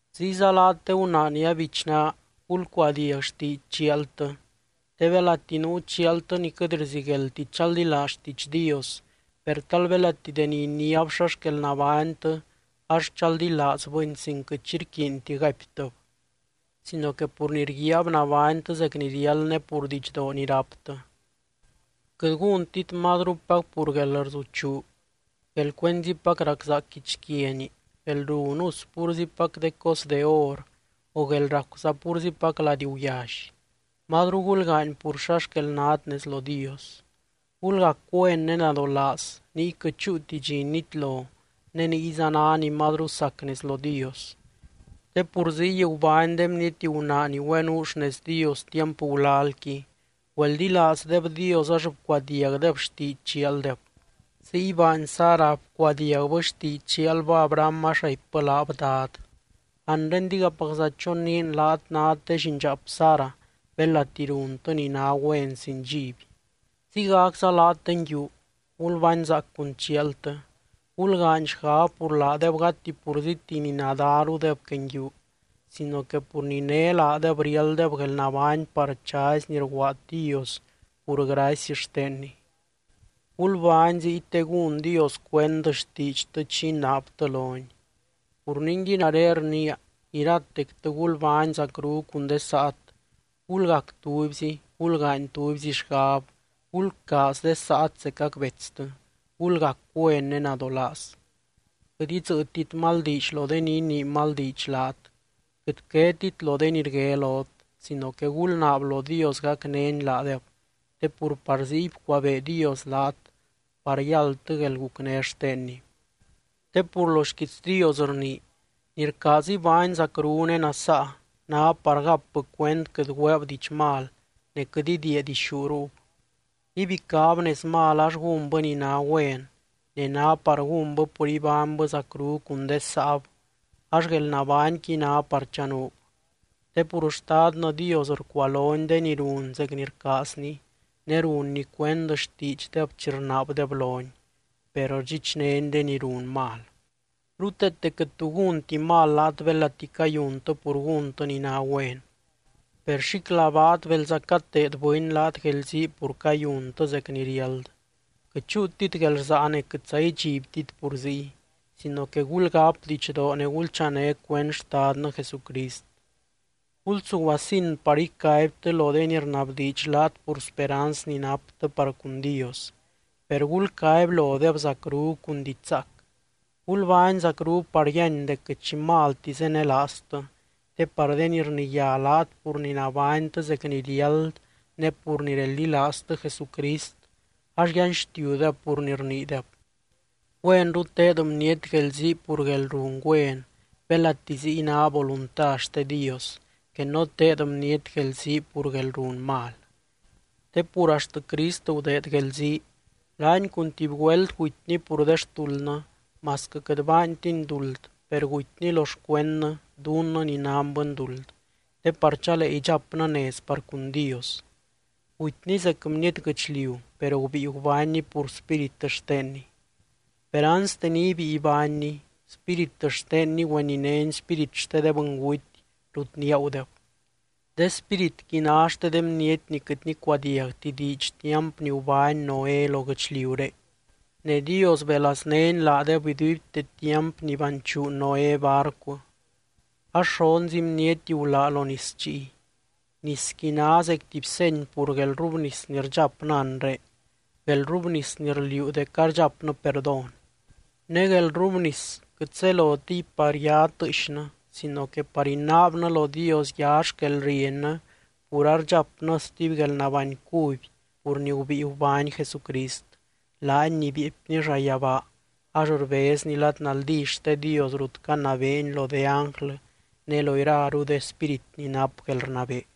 Ziyza laat de gunaa ni abichnaa, gulcuadiag xtiidx chialtɨ. Te belati nuu chialtɨ ni quɨt rzigueldti chaldilaaz xtiidx Dios, per tal belati deni iniáb xa xquel nabánytɨ ax chaldilaazbɨni sin quɨt xi rquiinti gaiptɨb, sino que pur ni rguiaab nabánytɨ zec ni riáld ne pur didxdoo ni ráptɨ. Quɨt gúntit mazrupac pur guelrzuchuu, guelcuenzipac raczaac guichquiani, guelrun us púrzipac de cos de or o guél racuza púrzipac lady guyally. Mazru gulgaany pur xa xquel nát nez lo Dios. Gulgac güen ne nadolaaz niy quɨt chúuti dxi nitlo ne niyza ná ni mazru sac nez lo Dios. Te pur ziy gubány de bniety gunaa ni güenuu xnez Dios tiamp gulalqui, güeldilaazdeb Dios ax bcuadiagdeb xtiidx chialdeb. Ziy baany Sara, bcuadiagbɨ xtiidx chialbɨ Abraham ax raipbɨ laab “dad”. Anre digapacza choniin laat nát de llindxaap Sara belati runtɨ ni ná güen sin dxiby. Ziygacza laat de nguiu, gulbánzaac cun chialtɨ. Gulgaany xgab pur laadeb gati purzíti ni nadárudeb que nguiu sino que pur ni né laadeb riálddeb guelnabány par chazy ni rguaad Dios pur gracy xtenny. Gulbány ziy te gún Dios cuend xtiidxtɨ chi inaabtɨ lony. Pur ningui nare rniia: Iratectɨ gulbány zacru cun de saat, gulgac tubyzi, gulgaany tubyzi xgab, gulcaaz de saat zecac betstɨ, gulgac güen ne nadolaaz. Quɨt idzɨ́ɨtit mal diidx lo de ni inii mal diidx laat, quɨt quetit lo de ni rgué lot sino que gulnaab lo Dios gacnény laadeb, te pur par ziy bcuabee Dios laat par yáldtɨ guelgucné xtenny. Te pur lo xquiits Dios rnii: Ni rcaaz ibány zacru ne nasaa, ná par gapbɨ cuend quɨt güeeb diidx mal ne quɨt idiia dixú ruub. Ibicáb nez mal ax gúnbɨ ni ná güen, ne ná par gúnbɨ pur ibánybɨ zacru cun de saab ax guelnabányqui ná par chanuub. Te pur Xtadnɨ Dios rcualony de ni run zec ni rcaazny ne runny cuend xtiidxdeb chi rnaabdeb lony, per rdxichnény de ni run mal. Ruteete quɨt tu gúnti mal laat belati cayuntɨ pur gúntɨ ni ná güen. Per xíclabaat belza cateed bɨny laat guelzii pur cayuntɨ zec ni riáld. Quɨt chúutit guelrsaa ne quɨtza idxibtit pur ziy, sino que gulgáp didxdoo ne gulchané cuend Xtadnɨ Jesucrist. Gulsuguasin par icaibtɨ lo de ni rnabdiidx laat pur speranz ni naptɨ par cun Dios, per gulcaby lodeb zacru cun diidx zaac. Gulbány zacru par yíany dec quɨt xi malti zenelaaztɨ, te par de ni rniyá laat pur ni nabánytɨ zec ni riáld ne pur ni reldilaaztɨ Jesucrist ax yanxtiudeb pur ni rniideb. Güenru teed bniety guelzii pur guelrun güen belati ziy ná volunta xte Dios, que no teed bniety guelzii pur guelrun mal. Te pur axt Crist gudeed guelzii. Laany cun tuby güelt gutyny pur de xtuldnɨ, masquɨ quɨt baantiny duld per gutyny lo xcuendnɨ dunnɨ ni nan bɨnduld, te par chalee idxapnɨ nez par cun Dios. Gutyny zec bniety guɨchliu, per gubíi gubánny pur spírit xtenny. Per anste ni ibíi ibánny, spírit xtenny güeninény spírit xte de bɨnguty rut niagudeb. De spíritqui ná xte de bniety ni quɨt nicuadiagti diidx tiamp ni gubány Noé lo guɨchliuré, ne Dios belaaznény laadeb iduibte tiamp ni baanchu Noé barcu. Ax xonzi bniety gulá lo nis chiy. Nisqui ná zec tuby seny pur guelrrubnis ni rdxapnɨ anre, guelrrubnis ni rliuu dec ardxapnɨ perdón. Ne guelrrubnis quɨt zelotiy par ya tɨɨxnɨ sino que par inaabnɨ lo Dios ya xquelriennɨ pur ardxapnɨ stuby guelnabány cuby pur ni gubíi gubány Jesucrist, laany ni bieepny llayabaa ax rbezny lad naldí xte Dios rut canabeeny lo de ánglɨ ne lo iraru de spírit ni nap guelrnabee.